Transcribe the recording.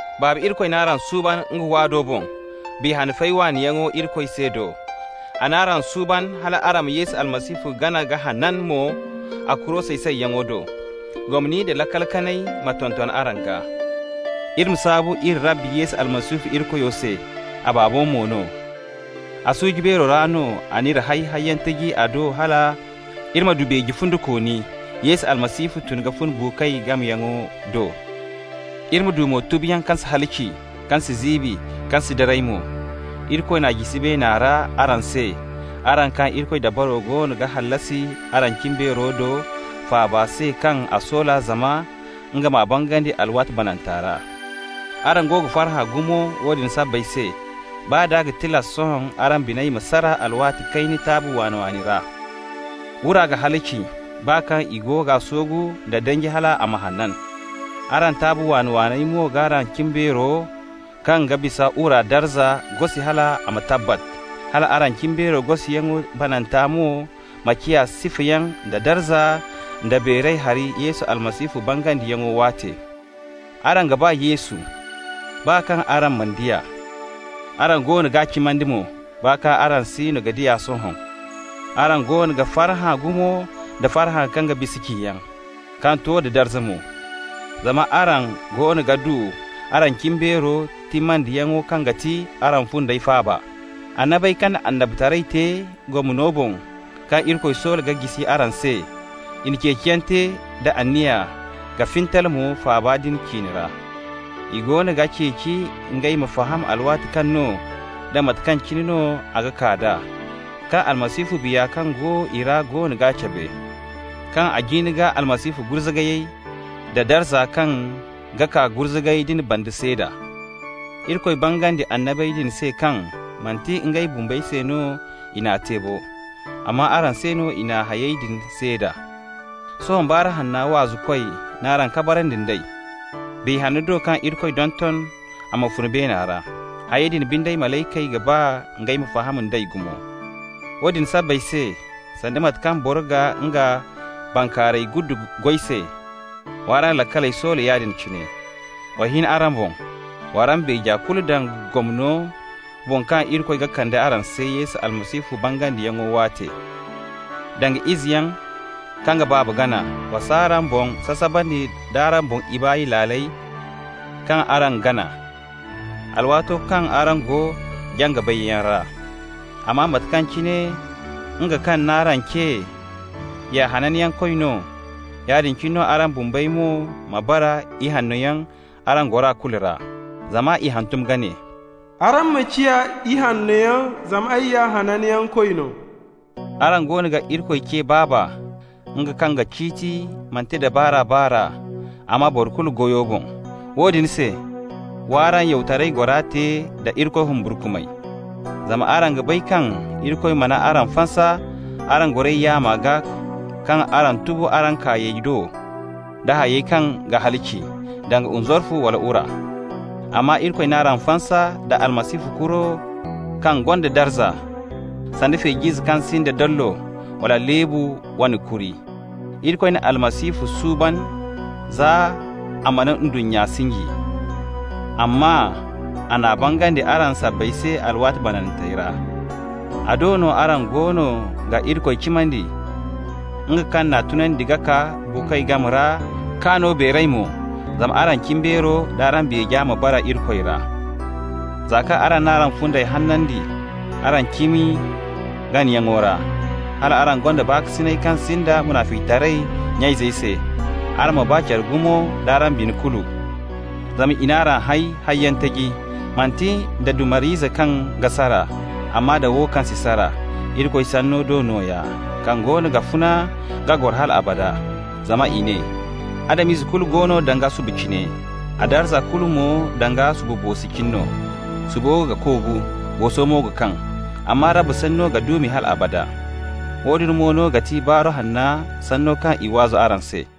Baaba Irikoy n'araŋ suuban nga waado boŋ, Biya Hanno fay waaniyaŋo Irikoy se do. A n'araŋ suuban hal araŋ ma Yesu Almasihu gana ka hanan mo a kuro say-sayyaŋo do. Gomni nda laakal kanay ma tonton araŋ gaa. Iri ma saabu iri Rabbi Yesu Almasihu Irikoyo se, a Baabo mo no. A suuji beero ra no a n'iri hay hayyaŋ taji a do hal iri ma du beeje fundikooni Yesu Almasihu tun ka fun buukoy game ra yaŋo do. Iri ma du mo tubuyaŋ kaŋ si halaci, kaŋ si ziibi, kaŋ si daray mo. Irikoy n'a jisi beena ra araŋ se, araŋ kaŋ Irikoy dabaro goono ga hallasi araŋ cimbeero do faaba se kaŋ a soola zama nga m'a bangandi alwaati bananta ra. Araŋ go ga farhã gumo woodin sabbay se, baa d'a ga tilas sohõ araŋ biney ma sara alwaati kayna taabi waani-waani ra. Wura ga halaci, baa kaŋ i g'a soogu nda danji hal a ma hanan. Araŋ taabi waani-waaney mo g'araŋ cimbeero, kaŋ ga bisa wura darza, gosi hal a ma tabbat, hal araŋ cimbeero gosiyaŋo bananta mo ma ciya sifayaŋ da darza nda beeray hari Yesu Almasihu bangandiyaŋo waate. Araŋ ga ba Yesu, baa kaŋ araŋ mana di a. Araŋ goono g'a cimandi mo, baa kaŋ araŋ siino ga di a sohõ. Araŋ goono ga farhã gumo nda farhã kaŋ ga bisa ciyaŋ, kaŋ to da darza mo. Zama araŋ goono ga du araŋ cimbeero timmandiyaŋo kaŋ ga ti araŋ fundey faaba. Annabey kaŋ na annabitaray te gomno boŋ kaŋ Irikoy soola ka jisi araŋ se, i na ceeciyaŋ te da anniya ka fintal mo faaba din ciine ra. I goono ga ceeci ngey ma faham alwaati kaŋ no da mate kaŋ cine no a ga kaa d'a, kaŋ Almasihu Biya kaŋ go i ra goono ga cabe, kaŋ a jin ka Almasihu gurzugayey da darza kaŋ ga kaa gurzugayey din banda seeda. Irikoy bangandi annabey din se kaŋ manti ngey bumbey se no i n'a te bo, amma araŋ se no i na hayey din seeda. Sohõ Baaru Hanna waazukoy n'araŋ kabarandi nd'ey, Biya Hanno do kaŋ Irikoy donton a ma fun beena ra. Hayey din binde, malaykey ga ba ngey ma faham d'ey gumo. Woodin sabbay se, sanda mate kaŋ boro ga nga bankaaray guddu goy se, w'araŋ laakaley soola yaadin cine. Wa hin araŋ boŋ, w'araŋ beeja kulu daŋ gomno boŋ kaŋ Irikoy ga kande araŋ se Yesu Almasihu bangandiyaŋo waate. Danga izeyaŋ kaŋ ga baaba gana, wa s'araŋ boŋ sasabandi d'araŋ doŋ ibaay laaley kaŋ araŋ gana, alwaato kaŋ araŋ go jaŋ-ka-bayyaŋ ra. Amma mate kaŋ cine nga kaŋ n'araŋ ce ya Hananyankoy no, yaadin cine no araŋ bumbey mo ma bara ihannoyaŋ araŋ gora kulu ra. Zama i n'a hantum ka ne: «Araŋ ma ciya ihannoyaŋ, Zama ay ya Hananyankoy no.» Araŋ goono ga Irikoy ce «Baaba», nga kaŋ ga ciiti manti nda baar'a-baar'a, amma boro kulu goyo boŋ. Woodin se, w'araŋ yawtaray gora te da Irikoy humburkumay. Zama araŋ ga bay kaŋ Irikoy mana araŋ fansa araŋ goray yaama gaa kaŋ araŋ tubu araŋ kaayey do da hayey kaŋ ga halaci, danga nzarfu wala wura. Amma Irikoy n'araŋ fansa nda Almasihu kuro kaŋ gonda darza, sanda feej'ize kaŋ sinda dollo wala leebu wane kuri. Irikoy na Almasihu suuban za a mana ndunnya sinji, amma a n'a bangandi araŋ sabbay se alwaati banantey ra. A do no araŋ goono ga Irikoy cimandi, nga kaŋ n'a tunandi ka kaa buukoy game ra k'a no beeray mo, zama araŋ cimbeero d'araŋ beeja ma bara Irikoy ra. Za kaŋ araŋ n'araŋ fundey hanandi araŋ cimi ganayaŋo ra, hal araŋ gonda baakasinay kaŋ sinda munaficitaray nya-izey se, araŋ ma ba care gumo d'araŋ bine kulu. Zama i n'araŋ hay hayyaŋ taji, manti nda dumar'ize kaŋ ga sara, amma da wo kaŋ si sara, Irikoy Sanno do nooya, kaŋ goono ga funa ka goro hal abada. Zama i ne: «Adam-ize kulu go danga subu cine, a darza kulu mo danga subu boosi cine no. Subu ga koogu, booso mo ga kaŋ, Amma Rabbi Sanno ga duumi hal abada.» Woodin mo no ga ti Baaru Hanna sanno kaŋ i waazu araŋ se.